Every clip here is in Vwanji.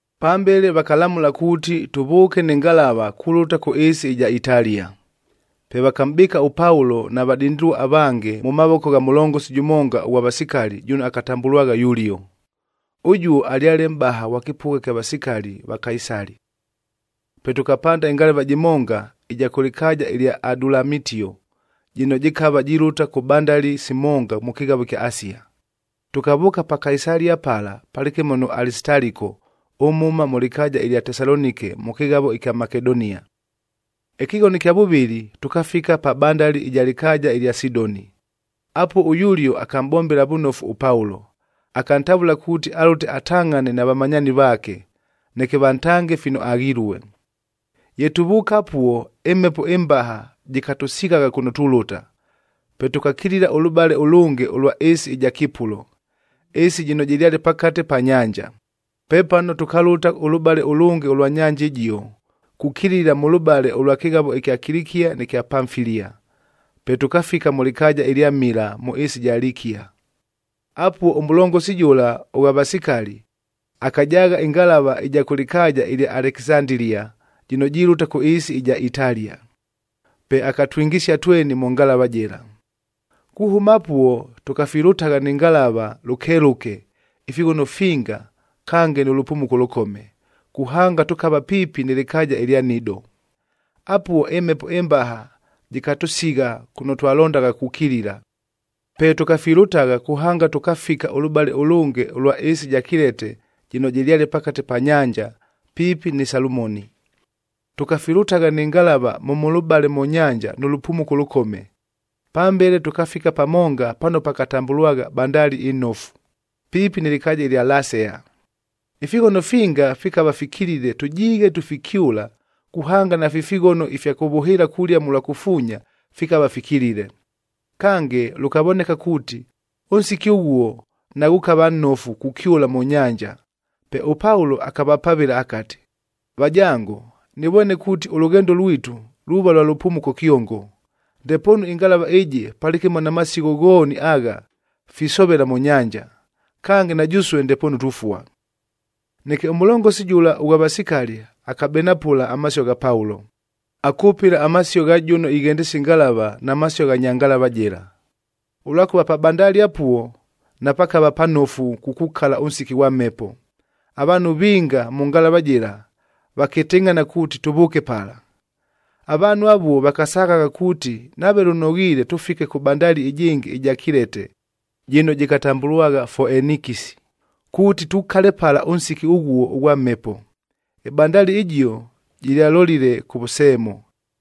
Pambele vakalamʉla kuuti tʉvʉʉke nɨ ngalava kulʉta kʉ ɨɨsi ɨja Italia. Pe vakamʼbɨɨka ʉPaulo na vadindilua avange mʉ mavoko gha mʉlongosi jʉmonga ʉghwa vasikali jʉno akatambʉlwagha Yulio. Ʉjuo alyale mʼbaha ghwa kɨpʉgha kya vasikali va Kaisali. Pe tʉkapanda ɨngalava jɨmonga ɨja kʉ lɨkaaja ɨlya Adulamitio jɨno jɨkava jilʉta kʉ bandalia simonga mʉ kɨghavo ɨkya Asia. Tʉkavʉʉka pa Kaisalia pala palɨkɨmo nʉ Alisitaliko ʉmhʉma mʉ lɨkaaja ɨlya Tesalonike mʉ kɨghavo ɨkya Makedonia. Ɨkɨghono ɨkya vʉvɨlɨ, tʉkafika pa bandali ɨja lɨkaaja ɨlya Sidoni. Apuo ʉYulio akamʼbombela vʉnofu ʉPaulo, akantavʉla kuuti alʉte atangʼhane na vamanyaani vaake, neke vantange fino aghilue. Ye tuvʉʉka apuo, ɨmhepo ɨmbaha jɨkatʉsighagha kʉno tulʉta, pe tʉkakilila ʉlʉbale ʉlʉnge ʉlwa ɨɨsi ɨja Kipulo, ɨɨsi jɨno jɨlyale pakate pa nyanja. Pepano tʉkalʉta ʉlʉbale ʉlʉnge ʉlwa nyanja ɨjio, kukilila mʉlʉbale ʉlwa kɨghavo ɨkya Kilikia nɨ kya Pamfilia, pe tʉkafika mʉ lɨkaaja ɨlya Mila mʉ ɨɨsi ɨja Likia. Apuo, ʉmʉlongosi jʉla ʉghwa vasikali, akajaagha ɨngalava ɨja kʉ lɨkaaja ɨlya Alekisandilia jɨno jilʉta kʉ ɨɨsi ɨja Italia, pe akatwingisia tweni mʉ ngalava jɨla. Kuhʉma apuo, tʉkafilʉtagha nɨ ngalava lʉkelʉke ifighono finga kange nʉ lʉpumuko ʉlʉkome, kuhanga tʉkava piipi nɨ lɨkaaja ɨlya Nido. Apuo ɨmhepo ɨmbaha jɨkatʉsigha kʉno twalondagha kukilila. Pe tʉkafilʉtagha kuhanga tʉkafika ʉlʉbale ʉlʉnge ʉlwa ɨɨsi ɨja Kilete jɨno jɨlyale pakate pa nyanja, piipi ni Salumoni. Tʉkafilʉtagha nɨ ngalava mʉ mʉlʉbale mʉ nyanja nʉ lʉpumuko ʉlʉkome. Pambele tʉkafika pamonga pano pakatambʉlwagha Bandali ɨNofu, piipi nɨ lɨkaaja ɨlya Lasea. Ifighono finga fikava fikilile tʉjiighe tufikyʉla kuhanga nafi fighono ifya kʉvʉhɨɨla kulia mʉlwa kufuunyab fikava fikilile. Kange, lʉkavoneka kuuti, ʉnsiki ʉghuo naghʉkava nnofu kukyʉla mʉ nyanja. Pe ʉPaulo akavapavɨla akati, “Vajango, nɨvwene kuuti ʉlʉghendo lwitu luuva lwa lʉpumuko kyongo, ndepoonu ɨngalava ɨjɨ palɨkɨmo na masigho ghooni agha, fisovela mʉ nyanja. Kange, na jʉsue ndepoonu tufua.” Neke ʉmʉlongosi jʉla ʉghwa vasikali akabenapʉla amasio gha Paulo, akʉpɨla amasio gha jʉno ighendesia ɨngalava na masio gha nya ngalava jɨla. Ʉlwakʉva pa bandali apuo napakava panofu kukukala ʉnsiki ghwa mhepo, avaanhu vinga mʉ ngalavac jɨla vakɨtɨngʼhana kuuti tʉvʉʉke pala. Avaanhu avuo vakasaghagha kuuti nave lʉnoghiile tʉfike kʉ bandali ɨjɨngɨ ɨja Kilete, jɨno jɨkatambʉlwagha Foenikisi, kuuti tukale pala ʉnsiki ʉghuo ʉghwa mhepo. Ɨbandali ɨjio jɨlyalolile kʉvʉseemo.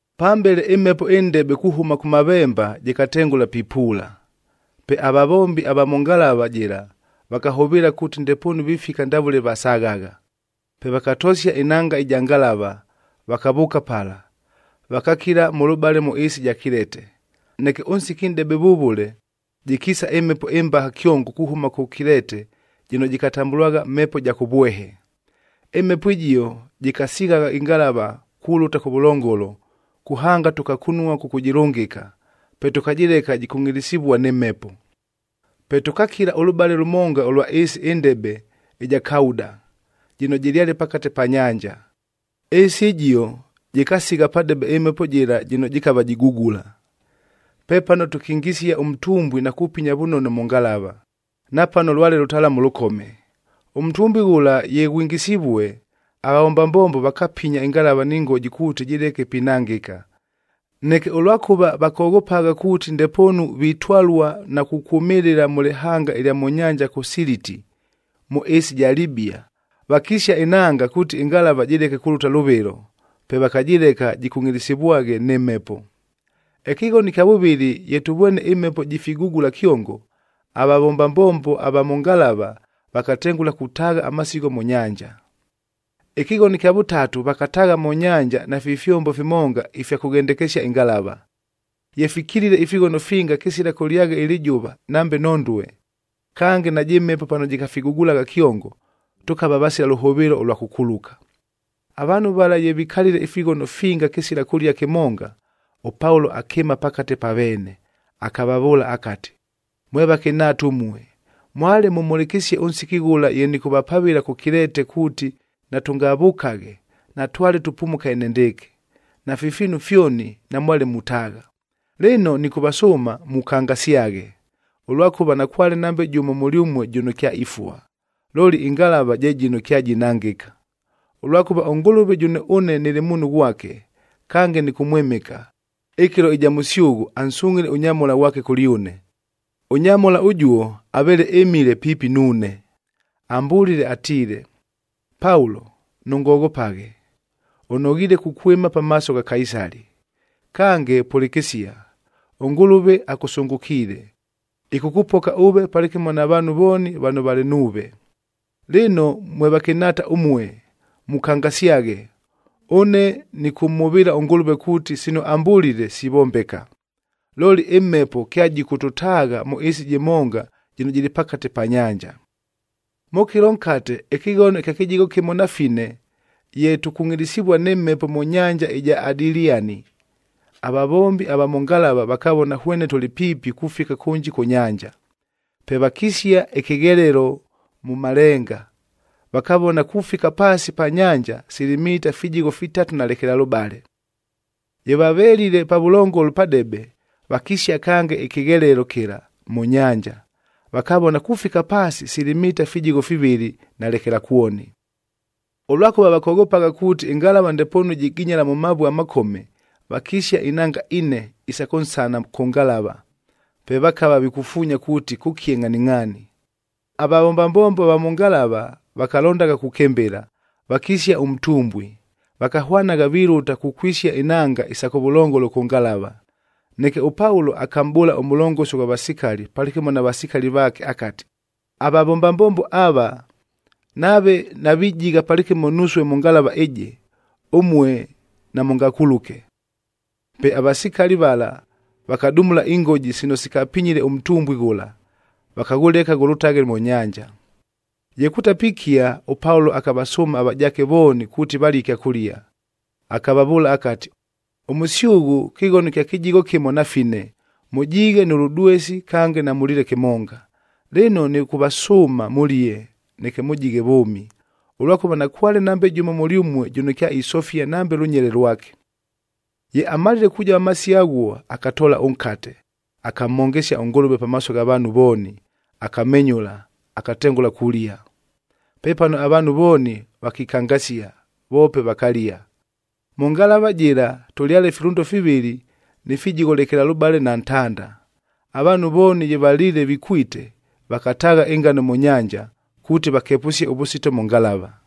Pambele, ɨmhepo ɨndebe kuhʉma kʉmavemba jɨkatengʉla pipuula. Pe avavombi ava mʉ ngalava jɨla vakahʉvɨɨla kuuti ndepoonu vifika ndavʉle vasaghagha. Pe vakatosia ɨnanga ɨja ngalava,d vakavʉʉka pala, vakakila mʉlʉbale mʉ ɨɨsi ɨja Kilete. Neke ʉnsiki nʼdebe vʉvʉle, jɨkiisa ɨmhepo ɨmbaha kyongo kuhʉma kʉ Kilete jɨno jɨkatambʉlwagha Mhepo ja Kʉvwehe. Ɨmhepo ɨjio jɨkasighagha ɨngalava kulʉta kʉvʉlongolo, kuhanga tʉkakunua kʉkʉjɨlʉngɨka. Pe tʉkajɨleka jikungʼilisivua nɨ mhepo. Pe tʉkakila ʉlʉbale lʉmonga ʉlwa ɨɨsi ɨndebe ɨja Kauda, jɨno jɨlyale pakate pa nyanja. Ɨɨsi ɨjio jɨkasigha padebe ɨmhepo jɨla jɨno jɨkava jigugula. Pepano tʉkingisia ʉntumbwie na kupinya vʉnono mʉ ngalava, napano lwale lʉtalamu lʉkome. Ʉntumbwi ghʉla ye ghwingisivue, avavomba mbombo vakapinya ɨngalava ni ngoji kuuti jɨleke pinangɨka. Neke ʉlwakʉva vakoghopagha kuuti ndepoonu vitwalua na kukwʉmɨlɨla mʉ lɨhanga ɨlya mʉ nyanja kʉ Siliti, mʉ ɨɨsi ɨja Libia, vakisia ɨnanga kuuti ɨngalava jɨleke kulʉta lʉvɨlo, pe vakajɨleka jɨkungʼilisivwaghe nɨ mhepo. Ɨkɨghono ɨkya vʉvɨlɨ ye tʉvwene ɨmhepo jifigugula kyongo, avavomba mbombo va mʉ ngalava vakatengʉla kutaagha amasigho mʉ nyanja. Ɨkɨghono ɨkya vʉtatu, vakataagha mʉ nyanja nafi fyombo fimonga ifya kʉghendekesia ɨngalava. Ye fikilile ifighono finga kɨsila kʉlyagha ɨlɨjʉva nambe nhondue, kange najɨ mhepo pano jɨkafigugulagha kyongo, tʉkava vasila lʉhʉvɨɨlo ʉlwa kʉkuluka. Avaanhu vala ye vikalile ifighono finga kɨsila kʉlia kɨmonga, ʉPaulo akɨɨma pakate pa veene, akavavʉʉla akati, “Mwe vakɨnhaata ʉmue, mwale mʉmhʉlɨkɨsie ʉnsiki ghʉla ye nɨkʉvapavɨla kʉ Kilete kuuti natʉngavʉkaghe, natwale tupumuka enendɨɨkɨ, nafi fiinu fyoni namwale mutaagha. Lɨno, nɨkʉvasʉʉma mukangasyaghe, ʉlwakʉva nakwale nambe jʉmo mʉlyʉmue jʉno kyaifua, looli ɨngalava je jɨno kyajinangɨka. Ʉlwakʉva ʉNgʉlʉve jʉno ʉne nɨlɨ muunhu ghwake, kange nɨkʉmwɨmɨka, ɨkɨlo ɨja mʉsyʉghʉ ansungʼhile ʉnyamhola ghwake kʉlyʉne. Ʉnyamhola ʉjuo aveele ɨmile piipi nuune, ambʉlile atiile, ‘Paulo, nʉngoghopaghe! Ʉnoghiile kukwɨma pamaaso gha Kaisali.f Kange, pʉlɨkɨsia, ʉNgʉlʉve akʉsʉngʉkiile, ɨkʉkʉpoka ʉve palɨkɨmo na vaanhu vooni vano valɨ nuuve.’ Lɨno mwe vakɨnhaata ʉmue mukangasyaghe, ʉne nɨkʉmhʉvɨɨla ʉNgʉlʉve kuuti sino ambʉlile, sivombeka. Looli ɨmhepo kyajɨkʉtʉtaagha mʉ ɨɨsi jɨmonga jɨno jɨlɨ pakate pa nyanja.” Mʉ kɨlo nkate ɨkɨghono ɨkya kɨjigho kɨmo na fine ye tukungʼilisivua nɨ mhepo mʉ nyanja ɨja Adiliani, avavombi va mʉ ngalava vakavona hwene tʉlɨ piipi kufika kʉnji kʉ nyanja. Pe vakisia ɨkɨghelelo mʉ malenga, vakavona kufika paasi pa nyanja sili mita fijigho fitatu na lekelalʉbale. Ye vavelile pavʉlongolo padebe, vakisia kange ɨkɨghelelo kɨla mʉ nyanja, vakavona kufika paasi sili mita fijigho fivɨlɨ na lekelakwoni. Ʉlwakʉva vakoghopagha kuuti, ɨngalava ndepoonu jiginyala mʉ mavue amakome, vakisia inanga ine isa kʉnsana kʉ ngalava. Pe vakava vikufuunya kuuti kʉkie ngʼhaningʼhaani. Avavomba mbombo va mʉ ngalava vakalondagha kukɨmbɨla, vakisia ʉntumbwi, vakahwanagha vilʉta kukwisia inanga isa kʉvʉlongolo kʉ ngalava. Neke ʉPaulo akamʼbʉʉla ʉmʉlongosi ʉghwa vasikali palɨkɨmo na vasikali vaake akati, “Avavomba mbombo ava, nave navijigha palɨkɨmo nusue mʉ ngalava ɨjɨ, ʉmue namʉngakuluke!” Pe avasikali vala vakadumula ingoji sino sikapinyile ʉntumbwi ghʉla, vakaghʉleka ghʉlʉtaghe mʉ nyanja. Ye kutapikia, ʉPaulo akavasʉʉma avajaake vooni kuuti valie ɨkyakʉlia, akavavʉʉla akati, “Ʉmʉsyʉghʉ kɨghono kya kɨjigho kɨmo na fine mʉjiighe nʉ lʉdwesi kange namʉliile kɨmonga. Lɨno, nɨkʉvasʉʉma mʉlie, neke mʉjighe vʉʉmi, ʉlwakʉva nakwale nambe jʉmo mʉlyʉmue jʉno kyaisofia nambe lʉnyele lwake.” Ye amalile kujova amasio aghuo, akatoola ʉnkate, akamhongesia ʉNgʉlʉve pamaaso gha vaanhu vooni, akamenyʉla, akatengʉla kulia. Pepano avaanhu vooni vakikangasia, voope vakalia. Mʉ ngalava jɨla tʉlyale filʉndo fivɨlɨ ni fijigho lekelalʉbale na ntanda. Avaanhu vooni ye valiile vikwite, vakataagha ɨngano mʉ nyanja, kuuti vakepʉsie ʉvʉsito mʉ ngalava.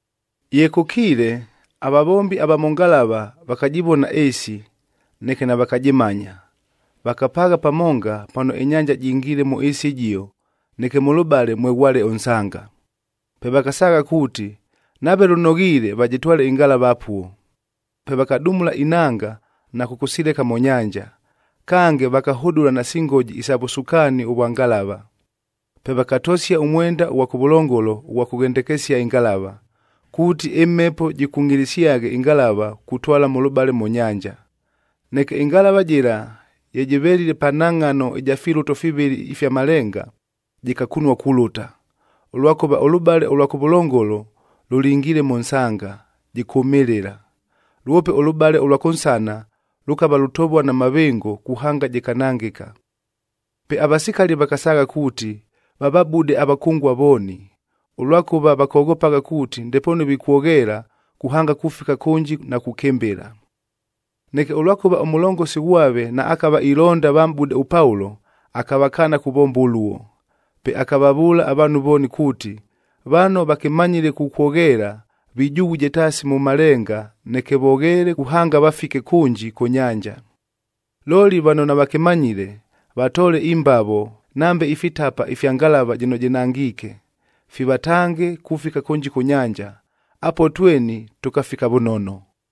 Ye kʉkiile, avavombi ava mʉ ngalava vakajɨvona ɨɨsi, neke navakajɨmanya. Vakapaagha pamonga pano ɨnyanja jingiile mʉ ɨɨsi ɨjio neke mʉlʉbale mweghwale ʉnsanga. Pe vakasaagha kuuti, nave lʉnoghiile vajɨtwale ɨngalava apuo. Pe vakadumula inanga na kʉkʉsileka mʉ nyanja, kange vakahʉdʉla nasi ngoji isa vʉsukaani ʉvwa ngalava. Pe vakatosia ʉmwenda ʉghwa kʉvʉlongolo ʉghwa kʉghendekesia ɨngalava,g kuuti ɨmhepo jɨkungʼilisyaghe ɨngalava kutwala mʉlʉbale mʉ nyanja. Neke ɨngalava jɨla ye jɨvelile pa nhangʼhano ɨja filʉto fivɨlɨ ifya malenga, jɨkakunua kulʉta, ʉlwakʉva ʉlʉbale ʉlwa kʉvʉlongolo lʉlingiile mʉ nsanga, jɨkʉmɨlɨla. Lwope ʉlʉbale ʉlwa kʉnsana lʉkava lutovua na mavɨngo kuhanga jɨkanangɨka. Pe avasikali vakasaagha kuuti vavabude avakʉngua vooni, ʉlwakʉva vakoghopagha kuuti ndepoonu vikwogheela kuhanga kufika kʉnji na kukɨmbɨla. Neke ʉlwakʉva ʉmʉlongosi ghwave naakava ilonda vamʼbude ʉPaulo, akavakaana kuvomba ʉluo. Pe akavavʉʉla avaanhu vooni kuuti, vano vakɨmanyile kukwogheela vijughuje taasi mʉ malenga neke vogheele kuhanga vafike kʉnji kʉ nyanja. Looli vano navakɨmanyile, vatoole imbavo nambe ifitapa ifya ngalava jɨno jɨnangiike, fivatange kufika kʉnji kʉ nyanja. Apuo tweni tʉkafika vʉnono.